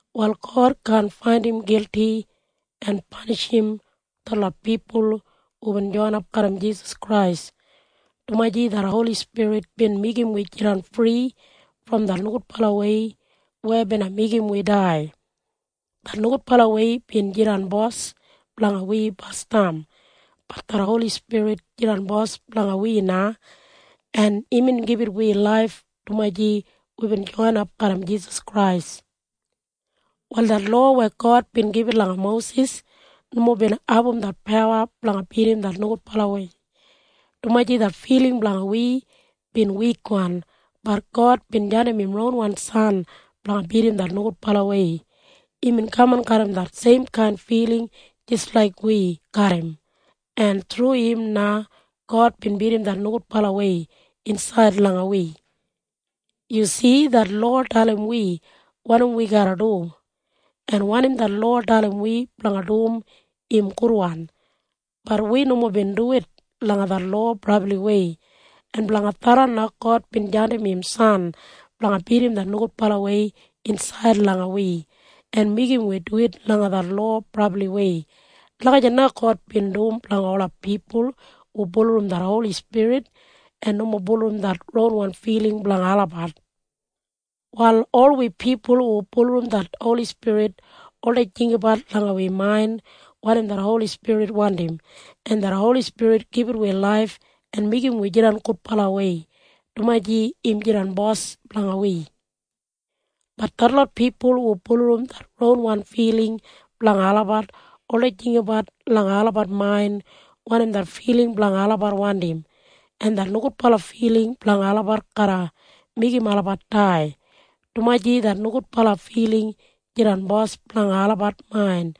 Wal God kaan faindim gilti en panishim detlot pipul hubin joinap garram Jisas Krais, dumaji det Holi Spirit bin meigim wi jidan fri brom det nogudbalawei na, weya meigim wi dai. Det nogudbalawei bin jidan bos blanga wi basdam. Bat det Holi Spirit jidan Bos blanga wi na, en imbin gibit wi laif dumaji wibin joinap garram Jisas Krais. Wal det lowa weya God bin gibit langa Mosis nomo bin abum det pawa blanga bidim det nogudbalawei, dumaji det filing blanga wi bin wikwan. Bat God bin jandim im ronwan San blanga bidim det nogudbalawei. Imbin kaman garram det seimkain filing jis laik wi garram, en thru im na God bin bidim det nogudbalawei insaid langa wi. Yumob si? Det lowa dalim wi wanim wi garra dum, en wanim det lowa dalim wi blanga dum im gudwan. Bat wi nomo bin duwit langa det lowa brabliwei. En blanga tharran na God bin jandim im San blanga bidim det nogudbalawei insaid langa wi en meigim wi duwit langa det lowa brabliwei. Lagijat na God bin dum blanga ola pipul hu bulurrum det Holi Spirit en nomo bulurrum det ronwan filing blanga olabat. Wal ol wi pipul hu bulurrum det Holi Spirit oldei jinggabat langa wi main wanim det Holi Spirit wandim, en det Holi Spirit gibit wi laif en meigim wi jidan gudbalawei, dumaji im jidan Bos blanga wi. Bat detlot pipul hu bulurrum det ronwan filing blanga olabat oldei jinggabat langa olabat main wanim det filing blanga olabat wandim, en det nogudbala filing blanga olabat garra meigim olabat dai, dumaji det nogudbala filing jidan bos blanga olabat main,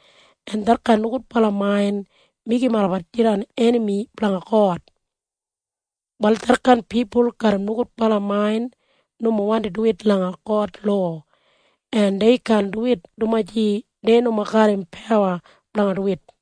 en detkain nogudbala main meigim olabat jidan enami blanga God. Wal detkain pipul garram nogudbala main nomo wandim duwit langa God lowa. En dei kaan duwit dumaji dei nomo garram pawa blanga duwit.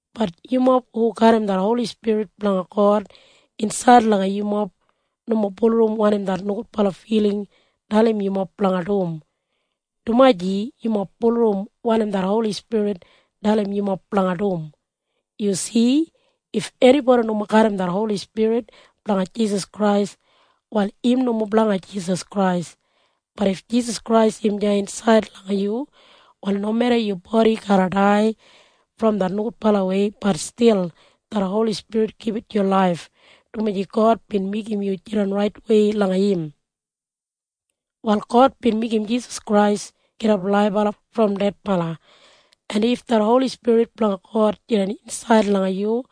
Bat yumob hu garram det Holi Spirit blanga God insaid langa yumob nomo bulurrum wanim det nogudbala filing dalim yumob blanga dum. Dumaji yumob bulurrum wanim det Holi Spirit dalim yumob blanga dum. Yu si? If enibodi nomo garram det Holi Spirit blanga Jisas Krais, wal im nomo blanga Jisas Krais. Bat if Jisas Krais im deya insaid langa yu, wal nomeda yu bodi garra dai brom det nogudbalawei, bat stil det Holi Spirit gibit yu laif, dumaji God bin meigim yu jidan raitwei langa im. Wal God bin meigim Jisas Krais gidap laibala brom dedbala, en if det Holi Spirit blanga God jidan insaid langa yu,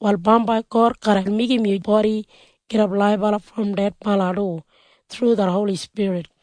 wal bambai God garra meigim yu bodi gidap laibala brom dedbala du, thru det Holi Spirit.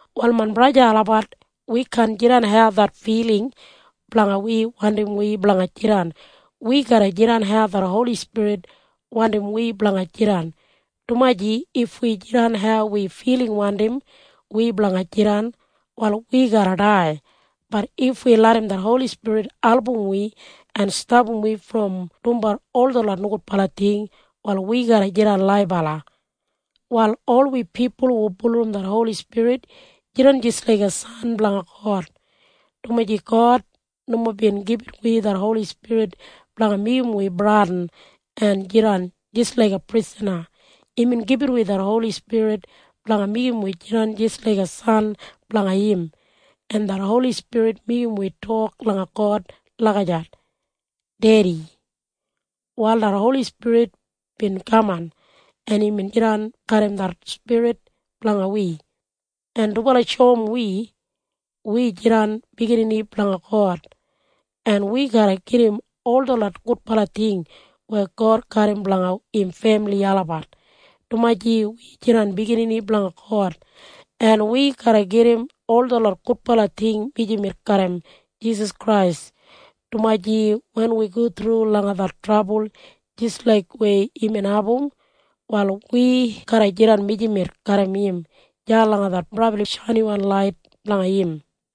Wal main braja en sista olabat, wi kaan jidan hau det filing blanga wi wandim wi blanga jidan. Wi garra jidan hau det Holi Spirit wandim wi blanga jidan, dumaji if wi jidan hau wi filing wandim wi blanga jidan, wal wi garra dai. Bat if wi larram det Holi Spirit album wi en stapam wi brom dumbat ol detlot nogudbala ting, wal wi garra jidan laibala. Wal ol wi pipul hu bulurrum det Holi Spirit jidan jis laiga biginini blanga God, dumaji God nomo bin gibit wi det Holi Spirit blanga meigim wi bradin en jidan jis laiga prisana. Imbin gibit wi det Holi Spirit blanga meigim wi jidan jis laiga biginini blanga im, en det Holi Spirit meigim wi tok langa God lagijat, “Dedi.” Wal det Holi Spirit bin kaman, en imbin jidan garram det spirit blanga wi, en dubala shoum wi, wi jidan biginini blanga God. En wi garra gedim ol detlot gudbala ting weya God garram blanga im femili olabat, dumaji wi jidan biginini blanga God. En wi garra gedim ol detlot gudbala ting mijamet garram Jisas Krais, dumaji wen wi go thru langa det trabul jis laik weya imbin abum, wal wi garra jidan mijamet garram im deya langa det brabli shainiwan lait blanga im.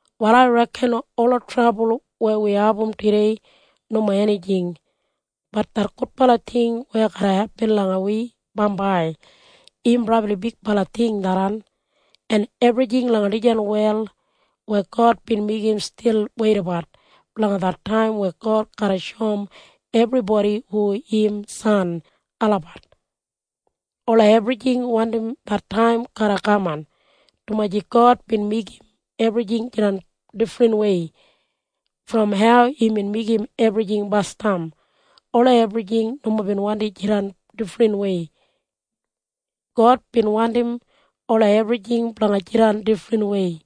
Wal ai reken ola trabul weya wi abum tudei nomo enijing. Bat det gudbala ting weya garra hepin langa wi bambai, im brabli bigbala ting tharran. En ebrijing langa dijan wel weya God bin meigim stil weidabat blanga det taim weya God garra shoum ebribodi hu im biginini olabat. Ola ebrijing wandim det taim garra kaman, dumaji God bin meigim ebrijing jidan difrinwei brom hau imbin meigim ebrijing gudbala basdam. Ola ebrijing nomo bin wandim jidan difrinwei. God bin wandim ola ebrijing blanga jidan difrinwei,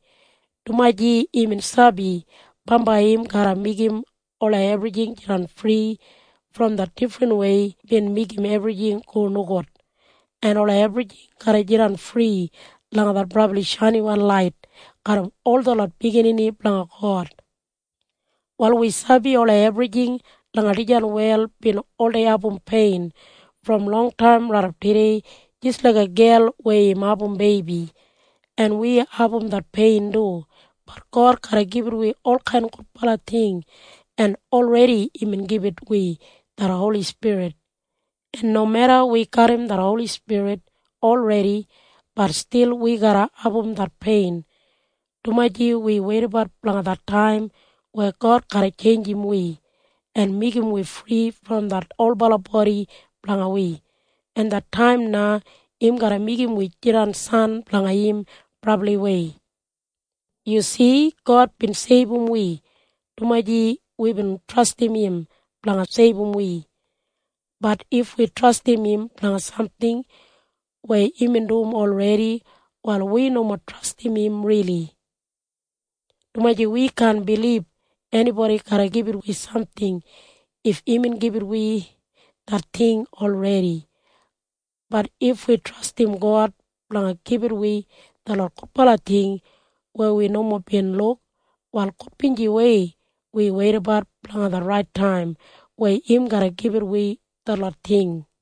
dumaji imbin sabi bambai im garra meigim ola ebrijing jidan fri brom det difrinwei weya bin meigim ebrijing go nogud, en ola ebrijing garra jidan fri langa det brabli shainiwan lait garram ol detlot biginini blanga God. Wal wi sabi ola ebrijing langa dijan wel bin oldei abum pein brom longtaim raidap tudei jis laiga gel weya im abum beibi. En wi abum det pein du. Bat God garra gibit wi olkain gudbala ting, en olredi imbin gibit wi det Holi Spirit. En nomeda wi garram det Holi Spirit olredi, bat stil wi garra abum det pein, dumaji wi weidabat blanga det taim weya God garra tjeinjim wi en meigim wi fri brom det olbala bodi blanga wi, en det taim na im garra meigim wi jidan biginini blanga im brabliwei. Yu si? God bin seibum wi dumaji wibin trastim im blanga seibum wi. Bat if wi trastim im blanga samting weya imbin dum olredi, wal wi nomo trastim im rili, dumaji wi kaan bilib enibodi garra gibit wi samting if imbin gibit wi det ting olredi. Bat if wi trastim God blanga gibit wi detlot gudbala ting weya wi nomo bin luk, wal gudbinjiwei wi weidabat blanga det rait taim weya im garra gibit wi detlot ting.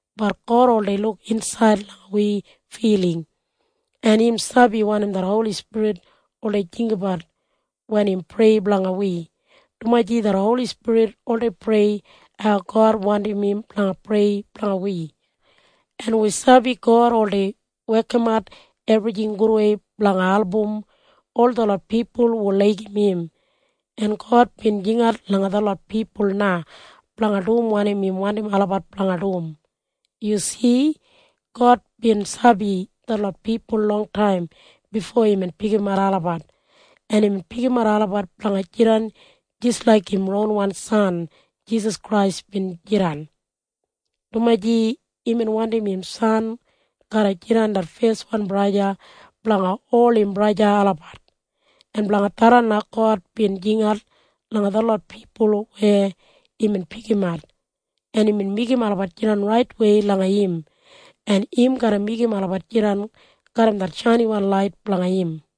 Bat God oldei luk insaid langa wi filing, en im sabi wanim det Holi Spirit oldei jinggabat wen im prei blanga wi, dumaji det Holi Spirit oldei prei hau God wandim im blanga prei blanga wi. En wi sabi God oldei wekimat ebrijing gudwei blanga album ol detlot pipul hu laigim im. En God bin jingat langa detlot pipul na blanga dum wanim im wandim olabat blanga dum. Yu si? God bin sabi detlot pipul longtaim bifo imbin pikimat olabat, en imbin pikimat olabat blanga jidan jis laik im ronwan San Jisas Krais bin jidan, dumaji imbin wandim im San garra jidan det feswan braja blanga ola biginini blanga God. En blanga tharran na God bin jingat langa detlot pipul weya imbin pikimat, en imbin meigim olabat jidan raitwei langa im, en im garra meigim olabat jidan garram det shainiwan lait blanga im.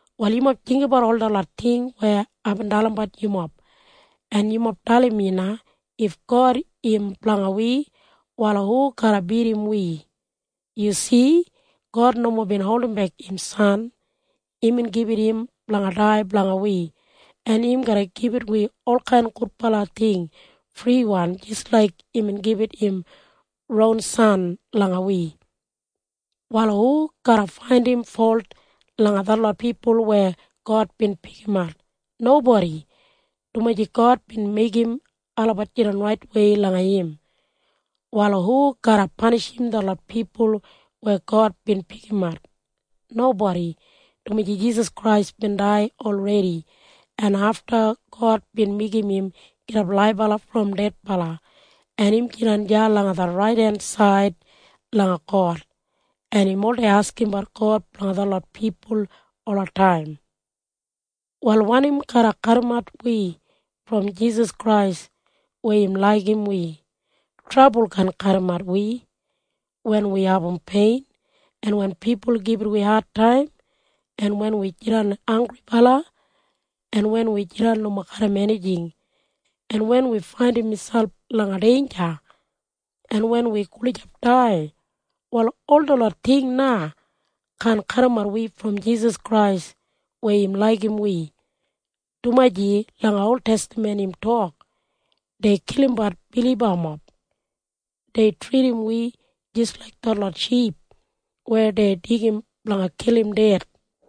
Wal yumob jinggabat ol detlot ting weya aibin dalimbat yumob, en yumob dalim mi na. If God im blanga wi, wal hu garra bidim wi? Yu si? God nomo bin holdimbek im San. Imbin gibit im blanga dai blanga wi. En im garra gibit wi olkain gudbala ting friwan jis laik imbin gibit im ron San langa wi. Wal hu garra faindim folt langa detlot pipul weya God bin pikimat? Nobodi, dumaji God bin meigim olabat jidan raitwei langa im. Wal hu garra panishim detlot pipul weya God bin pikimat? Nobodi, dumaji Jisas Krais bin dai olredi, en afta God bin meigim im gidap laibala brom dedbala, en im jidan deya langa det raidensaid langa God, en im oldei askimbat God blanga detlot pipul olataim. Wal wanim garra kadimat wi brom Jisas Krais weya im laigim wi? Trabul kaan kadimat wi. Wen wi abum pein, en wen pipul gibit wi adtaim, en wen wi jidan hanggribala, en wen wi jidan nomo garram enijing, en wen wi faindim miselp langa deinja, en wen wi gulijap dai, wal ol detlot ting na kaan kadimat wi brom Jisas Krais weya im laigim wi, dumaji langa oltestaman im tok, “Dei kilimbat bilibamob. Dei tridim wi jis laik detlot ship weya dei deigim blanga kilim ded.”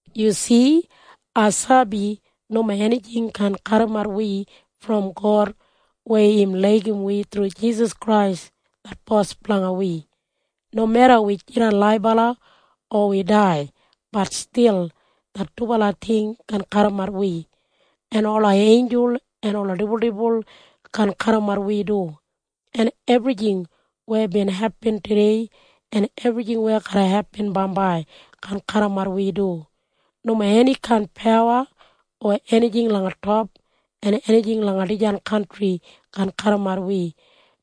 Yu si? Ai sabi nomo enijing kaan kadimat wi brom God weya im laigim wi thru Jisas Krais det Bos blanga wi. Nomeda wi jidan laibala o wi dai, bat stil det dubala ting kaan kadimat wi. En ola einjul en ola dibuldibul kaan kadimat wi du. En ebrijing weya bin hepin tudei en ebrijing weya garra hepin bambai kaan kadimat wi du. Nomo enikain pawa o enijing langa top o enijing langa dijan kantri kaan kadimat wi,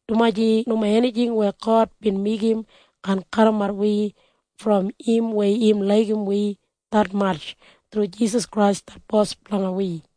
dumaji nomo enijing weya God bin meigim kaan kadimat wi brom im weya im laigim wi detmatj thru Jisas Krais det Bos blanga wi.